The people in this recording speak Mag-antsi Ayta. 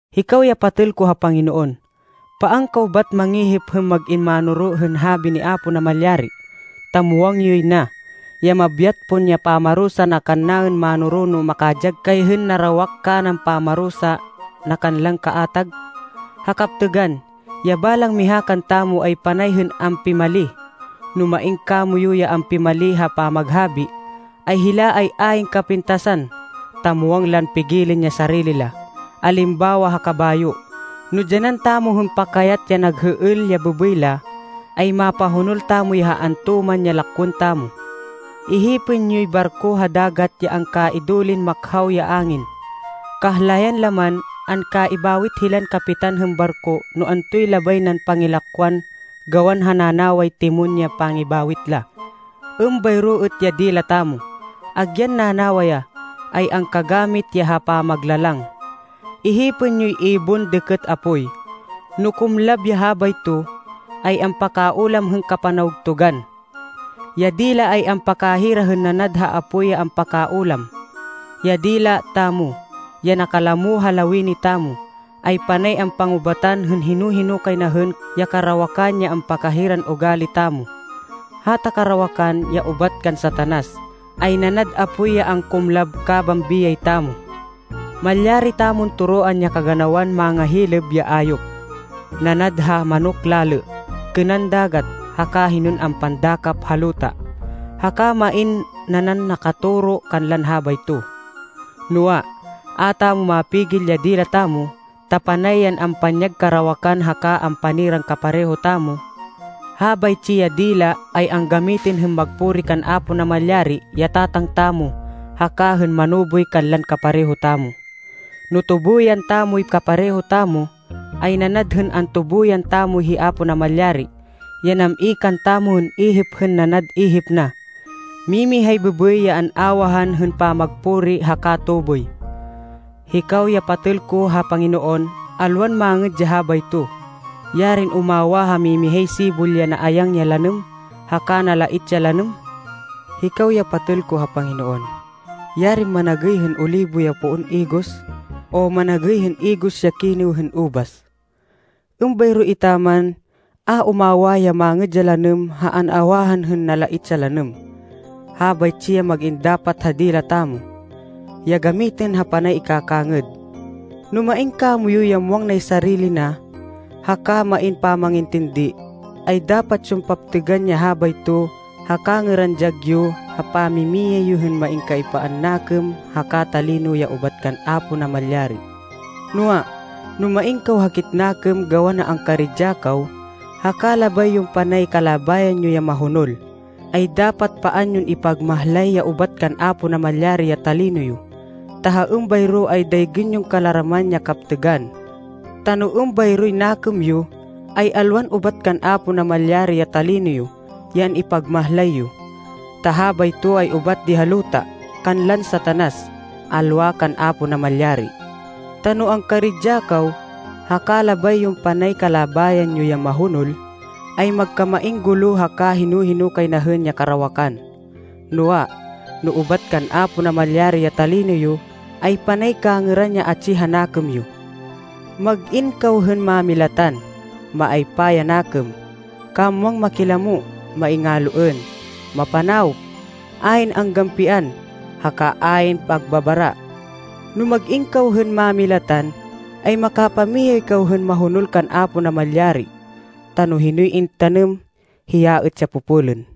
Hikaw ya patêl ko ha Panginoon, paan kaw bat mangihip hên mag-in mánoro hên habi ni Apo Namalyari, ta muwang yoy na, ya mabyat pon ya pamarusa na kannaên mánoro no makadyag kay hên narawak kanan pamarusa na kanlan kaatag. Ha kaptêgan, ya balang miha kantamo ay panay hên ampimali. No main kamoyu ya a ampimali ha pamaghabi, ay hila ay ayn kapintasan, ta muwang lan pigilên ya sarili la. Alimbawa ha kabayo, no dyanan tamo hên pakayat ya nag hêêl, ya bêbêy la, ay mapahonol tamo ya ha antoman ya lakwên tamo. Ihipên yoy barko ha dagat ya angkaidulin makhaw ya angin, kahlayan la man, angkaibawit hilan kapitan hên barko no antoy labay nan pangilakwan gawan ha nanaway timón ya pangibawit la. Êmbayro êt ya dila tamo, agyan nanawa ya, ay angkagamit ya ha pamaglalang. Ihipên yoy ibon dêkêt apoy, no kumlab ya habayto, ay ampakaulam hên kapanawgtugan. Ya dila ay ampakahira hên nanad ha apoy ya ampakaulam. Ya dila tamo, ya nakalamo ha lawini tamo, ay panay ampangubatan hên hino-hino kay na hên ya karawakan ya ampakahiran ugali tamo. Hata karawakan, ya ubat kan Satanas, ay nanad apoy ya angkumlab kaban biyay tamo. Malyari tamon toroan ya kaganawan mangahilêb ya ayop, nanad ha manok lalê, kênan dagat, haka hinon ampandakap ha luta. Haka main nanan nakatoro kanlan habayto, noa, a tamo mapigil ya dila tamo, ta panay yan ampanyag karawakan haka ampaniran kapareho tamo. Habaytsi ya dila ay anggamitên hên magpuri kan Apo Namalyari ya Tatang tamo haka hên manuboy kanlan kapareho tamo. No tubuyan tamoy kapareho tamo ay nanad hên antubuyan tamo hi Apo Namalyari, ya nam-i kantamo hên ihip hên nanad ihip na. Mimihay bêbêy ya an-awahan hên pamagpuri haka tuboy. Hikaw ya patêl ko ha Panginoon, alwan mangêd ya habayto. Yarin umawah ha mimihay sibol ya naayang ya lanêm haka nalait ya lanêm! Hikaw ya patêl ko ha Panginoon, yarin managêy hên olibo ya poon igos, o managêy hên igos ya kinêw hên ubas! Êmbayro etaman, a umawah ya mangêd ya lanêm ha an-awahan hên nalait ya lanêm. Habaytsi ya mag-in dapat ha dila tamo, ya gamitên ha panay ikakangêd. No main kamoyu ya muwang nay sarili na haka main pamangintindi, ay dapat yon paptêgan ya habayto ha kangêran dyag yo ha pamimiyay yo hên main kaaypaan nakêm haka talino ya ubat kan Apo Namalyari. Noa, no main kaw hakit nakêm gawan ha angkaridya kaw, haka labay yon panay kalabayan yo ya mahonol, ay dapat paan yon ipagmahlay ya ubat kan Apo Namalyari ya talino yo, ta ha êmbayro ay daygên yon kalaraman ya kaptêgan. Ta no êmbayroy nakêm yo, ay alwan ubat kan Apo Namalyari ya talino yo ya an-ipagmahlay yo. Ta habayto ay ubat di ha luta, kanlan Satanas, alwa kan Apo Namalyari. Ta no angkaridya kaw, haka labay yon panay kalabayan yo ya mahonol, ay magkamain gulo haka hino-hino kay na hên ya karawakan. Noa, no ubat kan Apo Namalyari ya talino yo, ay panay kangêran ya atsi ha nakêm yo. Mag-in kaw hên mámilatan, maaypa ya nakêm, kamwang makilamo, maingaloên, mapanawop, ayn anggampian, haka ayn pagbabara. No mag-in kaw hên mámilatan, ay makapamiyay kaw hên mahonol kan Apo Namalyari, ta no hinoy intanêm, hiya êt ya popolên.